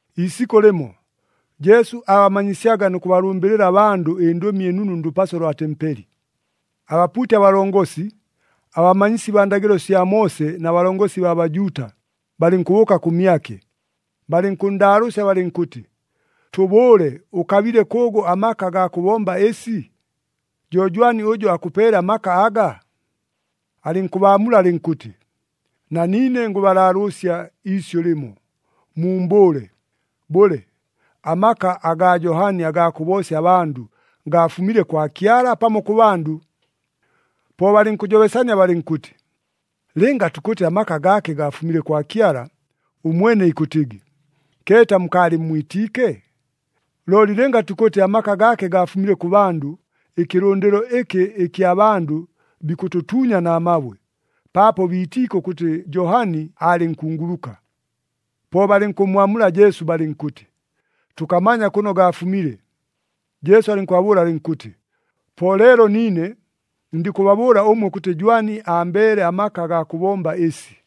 Iisikʉ lɨmo, Jesu aabamanyisyaga nʉ kʉbalʉmbɨlɨla abandʉ ɨNdʉmi ɨNunu ndʉpaso lwa tempeli. Abapuuti abalongosi, abamanyisi baa ndagɨlo sya Moose na balongosi baa Bajuuta, balɨnkʉbʉʉka kʉmyake, balɨnkʉnndaalʉʉsya balɨnkʉtɨ, “Tʉbʉʉle, ʉkabile kʉʉgʉ amaka agaa kʉbomba ɨsi? Jo jwani ʉjʉ akʉpeele amaka aga?” Alɨnkʉbaamula alɨnkʉtɨ, “Na niine ngʉbalaalʉʉsya iisyʉ lɨmo. Muumbʉʉle, bʉle, amaka agaa Johani agaa kʉboosya abandʉ gaafumile kwa Kyala, pamo kʉ bandʉ?” Po balɨnkʉjobesania balɨnkʉtɨ, “Lɨnga tukʉtɨ amaka gaake gaafumile kwa Kyala, ʉmwene ikʉtɨgɨ, ‘Keeta mukaalɨmmwitiike?’ Looli lɨnga tukʉtɨ amaka gaake gaafumile kʉ bandʉ, ɨkɨlʉndɨlo ɨkɨ ɨkya bandʉ bikʉtʉtuunya na mabwe, paapo biitiike ʉkʉtɨ Johani aalɨ nkunguluka.” Po balɨnkʉmmwamula Jesu balɨnkʉtɨ, “Tʉkamanya kʉno gaafumile.” Jesu alɨnkʉbabʉʉla alɨnkʉtɨ, “Po leelo niine, ndikʉbabʉʉla ʉmwe ʉkʉtɨ jwani ambeele amaka agaa kʉbomba ɨsi.”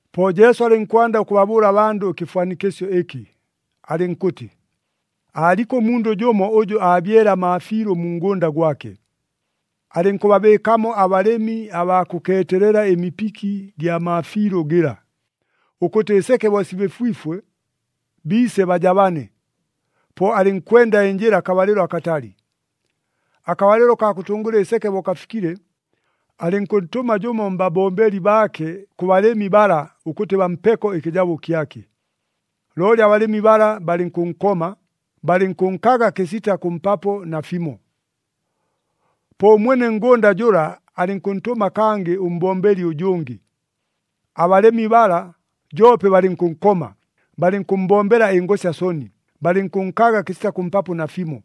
Po Jesu alɨnkwanda ʉkʉbabʉʉla abandʉ ɨkɨfwanikɨsyo ɨkɨ, alɨnkʉtɨ, “Aaliko ʉmundʉ jʉmo ʉjʉ aabyele amaafiilʉ mu ngʉnda gwake. Alɨnkʉbabɨɨkamo abalɨmi abaa kʉkeetelela ɨmipiki gya maafiilʉ gɨla, ʉkʉtɨ ɨseke bo sibɨfwifwe, biise bajabane. Po alɨnkwenda ɨnjɨla akabalɨlo akatali. Akabalɨlo kaa kʉtʉngʉla ɨseke bo kafikile, alɨnkʉntʉma jʉmo mbabombeli baake kʉ balɨmi bala ʉkʉtɨ bampeko ɨkɨjabo kyake. Looli abalɨmi bala balɨnkʉnkoma, balɨnkʉnkaga kɨsita kʉmpapo nafimo. “Po ʉmwene ngʉnda jʉla alɨnkʉntʉma kangɨ ʉmbombeli ʉjʉngɨ. Abalɨmi bala joope balɨnkʉnkoma, balɨnkʉmmbombela ɨngosya soni, balɨnkʉnkaga kɨsita kʉmpapo nafimo.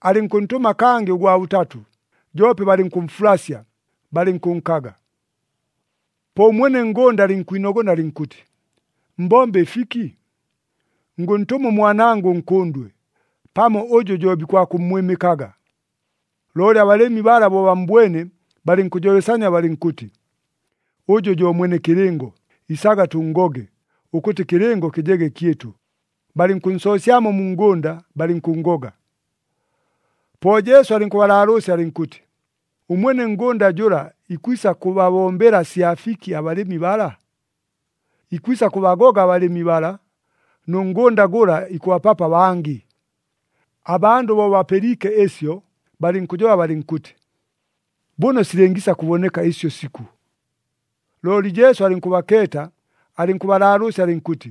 Alɨnkʉntʉma kangɨ ʉgwa bʉtatʉ, joope balɨnkʉmfulasya, balɨnkʉnkaga. “Po ʉmwene ngʉnda alɨnkwinogona alɨnkʉtɨ, ‘Mbombe ɨfiki? Ngʉntʉma ʉmwanangʉ ʉnkʉndwe. Pamo ʉjʉ jo bikwakʉmmwɨmɨkaga.’ Looli abalɨmi bala bo bammbwene, balɨnkʉjobesania balɨnkʉtɨ, ‘Ʉjʉ jo mwene kɨlɨngo. Isaga tʉnngoge, ʉkʉtɨ ɨkɨlɨngo kɨjege kyɨtʉ.’ Balɨnkʉnsoosyamo mu ngʉnda, balɨnkʉnngoga.” Po Jesu alɨnkʉbalaalʉʉsya alɨnkʉtɨ, “Ʉmwene ngʉnda jʉla ikwisa kʉbabombela sya fiki abalɨmi bala? Ikwisa kʉbagoga abalɨmi bala, nʉ ngʉnda gʉla ikʉbapapo abangɨ!” Abandʉ bo bapɨliike ɨsyo, balɨnkʉjoba balɨnkʉtɨ, “Bʉno silɨngiisa kʉboneka ɨsyo sikʉ!” Looli Jesu alɨnkʉbakeeta, alɨnkʉbalaalʉʉsya alɨnkʉtɨ,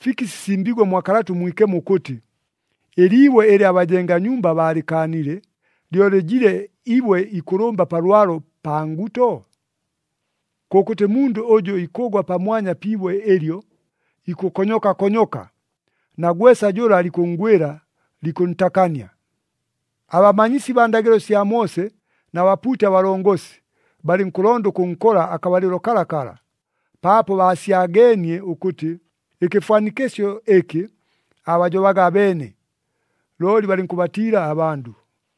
“Fiki sisimbiigwe mwa Kalata ʉMwikemo ʉkʉtɨ, ‘Ɨliibwe ɨlɨ abajenga nyumba baalɨkaanile, lyo lɨjile ibwe ikʉlʉmba pa lwalo, pa nguto’? “Kʉkʉtɨ mundʉ ʉjʉ ikʉgwa pamwanya pi ibwe ɨlyo, ikʉkonyoka konyoka, na gwesa jʉla likʉnngwɨla, likʉntakania.” Abamanyisi baa ndagɨlo sya Moose na bapuuti abalongosi, balɨnkʉlonda ʉkʉnkola akabalɨlo kalakala, paapo baasyageenie ʉkʉtɨ, ɨkɨfwanikɨsyo ɨkɨ aabajobaga abeene. Looli balɨnkʉbatiila abandʉ.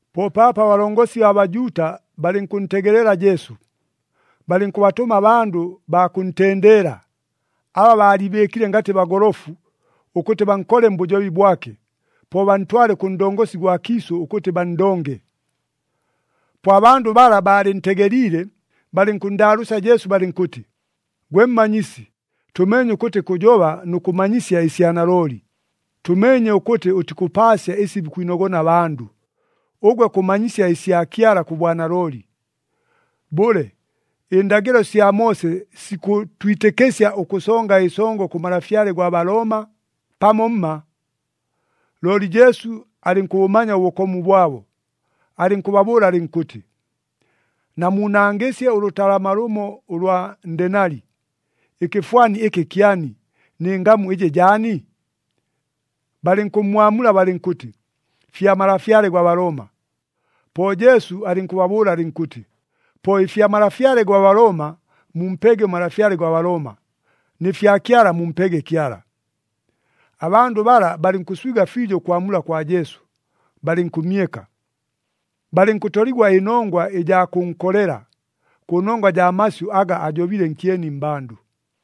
Po paapo abalongosi baa Bajuuta balɨnkʉntegelela Jesu. Balɨnkʉbatʉma abandʉ baa kʉntendeela, aba baaliibɨɨkile ngatɨ bagolofu, ʉkʉtɨ bankole mbʉjobi bwake, po bantwale kʉ ndongosi gwa kiisʉ ʉkʉtɨ banndonge. Po abandʉ bala baalɨntegeliile, balɨnkʉnndaalʉʉsya Jesu balɨnkʉtɨ, “Gwe Mmanyisi, tʉmeenye ʉkʉtɨ kʉjoba nʉ kʉmanyisya ɨsya nalooli. Tʉmeenye ʉkʉtɨ ʉtikʉpaasya ɨsi bikwinogona abandʉ, ʉgwe kʉmanyisya ɨsya Kyala kʉ bwanalooli. Bʉle, ɨndagɨlo sya Moose sikʉtwitɨkɨsya ʉkʉsonga ɨsongo kʉ malafyale gwa Balooma, pamo mma?” Looli Jesu alɨnkʉbʉmanya ʉbʉkomu bwabo, alɨnkʉbabʉʉla alɨnkʉtɨ, “Namuunangɨsye ʉlʉtalama lʉmo ʉlwa ndenali. Ɨkɨfwani ɨkɨ kyani, nɨ ngamu ɨjɨ jaani?” Balɨnkʉmmwamula balɨnkʉtɨ, “Fya malafyale gwa Balooma.” Po Jesu alɨnkʉbabʉʉla alɨnkʉtɨ, “Po ɨfya malafyale gwa Balooma mumpege ʉmalafyale gwa Balooma, nɨ fya Kyala mumpege Kyala.” Abandʉ bala balɨnkʉswiga fiijo ʉkwamula kwa Jesu, balɨnkʉmyeka. Balɨnkʉtoligwa ɨnongwa ɨjaa kʉnkolela, kʉnongwa jaa masyʉ aga ajobile nkyeni mmbandʉ.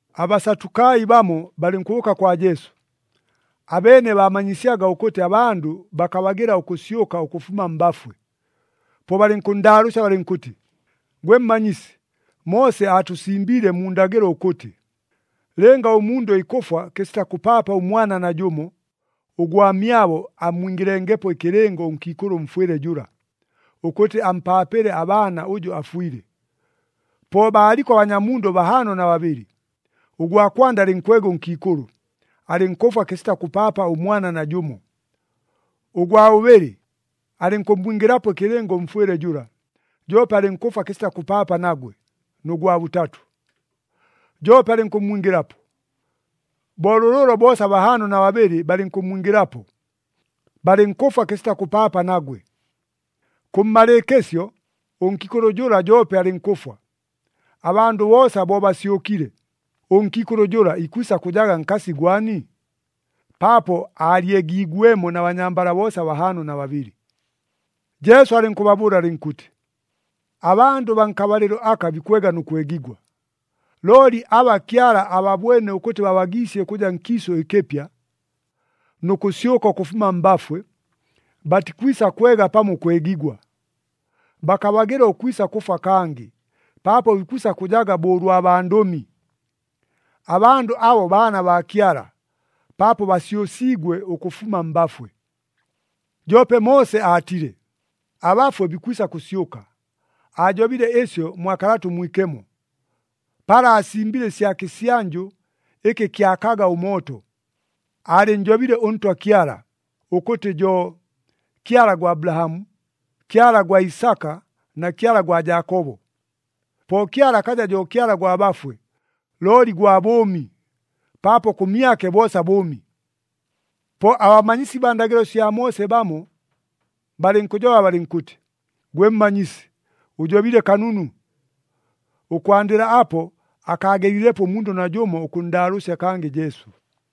ABasatukai bamo balɨnkʉbʉʉka kwa Jesu. Abeene baamanyisyaga ʉkʉtɨ abandʉ bakabagɨla ʉkʉsyʉka ʉkʉfuma mbafwe. Po balɨnkʉnndaalʉʉsya balɨnkʉtɨ, “Gwe Mmanyisi, Moose aatʉsimbiile mu ndagɨlo ʉkʉtɨ, ‘Lɨnga ʉmundʉ ikʉfwa kɨsita kʉpaapa ʉmwana najʉmo, ʉgwamyabo ammwingɨlengepo ɨkɨlɨngo ʉnkiikʉlʉ ʉmfwɨle jʉla, ʉkʉtɨ ampaapɨle abaana ʉjʉ afwile.’ Po baaliko abanyamundʉ bahaano na babɨlɨ. Ʉgwa kwanda alɨnkwega ʉnkiikʉlʉ, alɨnkʉfwa kɨsita kʉpaapa ʉmwana najʉmo. Ʉgwa bʉbɨlɨ [alɨnkʉmmwingɨlapo ɨkɨlɨngo ʉmfwɨle jʉla, joope alɨnkʉfwa kɨsita kʉpaapa nagwe,] nʉ gwa bʉtatʉ, joope alɨnkʉmmwingɨlapo. Bo lʉlʉʉlo boosa bahaano na babɨlɨ balɨnkʉmmwingɨlapo, balɨnkʉfwa kɨsita kʉpaapa nagwe. Kʉmmalɨɨkɨsyo, ʉnkiikʉlʉ jʉla joope alɨnkʉfwa. Abandʉ boosa bo basyʉkile, ʉnkiikʉlʉ jʉla ikwisa kʉjaga nkasi gwani? Paapo aalyegiigwemo na banyambala boosa bahaano na babɨlɨ.” Jesu alɨnkʉbabʉʉla alɨnkʉtɨ, “Abandʉ baa nkabalɨlo aka bikwega nʉ kwegigwa. Looli aba Kyala ababwene ʉkʉtɨ babagiisye ʉkʉja nkiisʉ ɨkɨpya, nʉ kʉsyʉka ʉkʉfuma mbafwe, batikwisa kwega pamo ʉkwegigwa. Bakabagɨla ʉkwisa kʉfwa kangɨ, paapo bikwisa kʉjaga bo ʉlwa bandʉmi. Abandʉ abo baana baa Kyala, paapo basyʉsiigwe ʉkʉfuma mbafwe. “Joope Moose aatile, abafwe bikwisa kʉsyʉka. Aajobile ɨsyo mwa Kalata ʉMwikemo, pala aasimbile ɨsya kɨsyanjʉ ɨkɨ kyakaga ʉmooto. Aalɨnnjobile ʉNtwa Kyala, ʉkʉtɨ jo, ‘Kyala gwa Abulahamu, Kyala gwa Isaka na Kyala gwa Jaakobo.’ Po Kyala akaja jo Kyala gwa bafwe, looli gwa bʉʉmi, paapo kʉmyake boosa bʉʉmi.” Po abamanyisi baa ndagɨlo sya Moose bamo, balɨnkʉjoba balɨnkʉtɨ, “Gwe Mmanyisi, ʉjobile kanunu!” Ʉkwandɨla apo, akaagelilepo ʉmundʉ najʉmo ʉkʉnndaalʉʉsya kangɨ Jesu.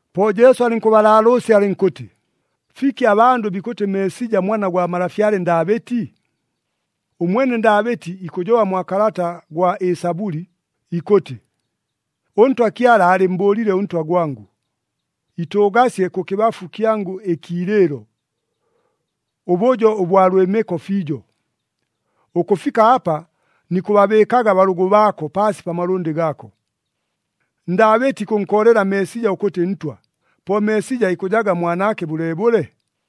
Po Jesu alɨnkʉbalaalʉʉsya alɨnkʉtɨ, “Fiki abandʉ bikʉtɨ Meesija Mwana gwa malafyale Ndaabɨti? Ʉmwene Ndaabɨti ikʉjoba mwa kalata gwa Ɨsabʉli ikʉtɨ, ‘ɄNtwa Kyala aalɨmmbʉʉlile ʉNtwa gwangʉ, “Itʉʉgasye kʉkɨbafu kyangʉ ɨkiilɨɨlo, ʉbʉjo ʉbwa lwɨmɨko fiijo, ʉkʉfika apa nikʉbabɨɨkaga abalʉgʉ baako paasi pa malʉndɨ gaako.” ’ “Ndaabɨti ikʉnkoolela Meesija ʉkʉtɨ Ntwa. Po Meesija ikʉjaga mwanaake bʉleebʉle?”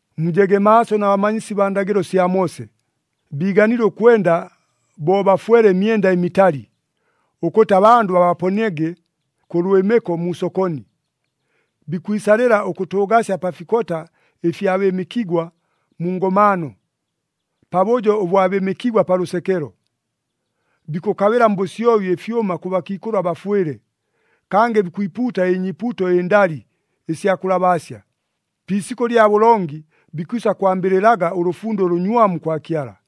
“Mujege maaso na bamanyisi baa ndagɨlo sya Moose. Biiganile ʉkwenda bo bafwele ɨmyenda ɨmitali, ʉkʉtɨ abandʉ babaponiege kʉ lwɨmɨko mu sokoni. Bikwisalɨla ʉkʉtʉʉgasya pa fikota ɨfya bɨɨmɨkigwa mu ngomaano, pabʉjo ʉbwa bɨɨmɨkigwa pa lʉsekelo. Bikʉkabɨla mbʉsyobi ɨfyʉma kʉ bakiikʉlʉ abafwɨle, kangɨ bikwipuuta ɨnyiipuuto ɨndali, ɨsya kʉlabaasya. Pi isikʉ lya bʉlongi, bikwisa kwambɨlɨlaga ʉlʉfundo ʉlʉnywamu kwa Kyala!”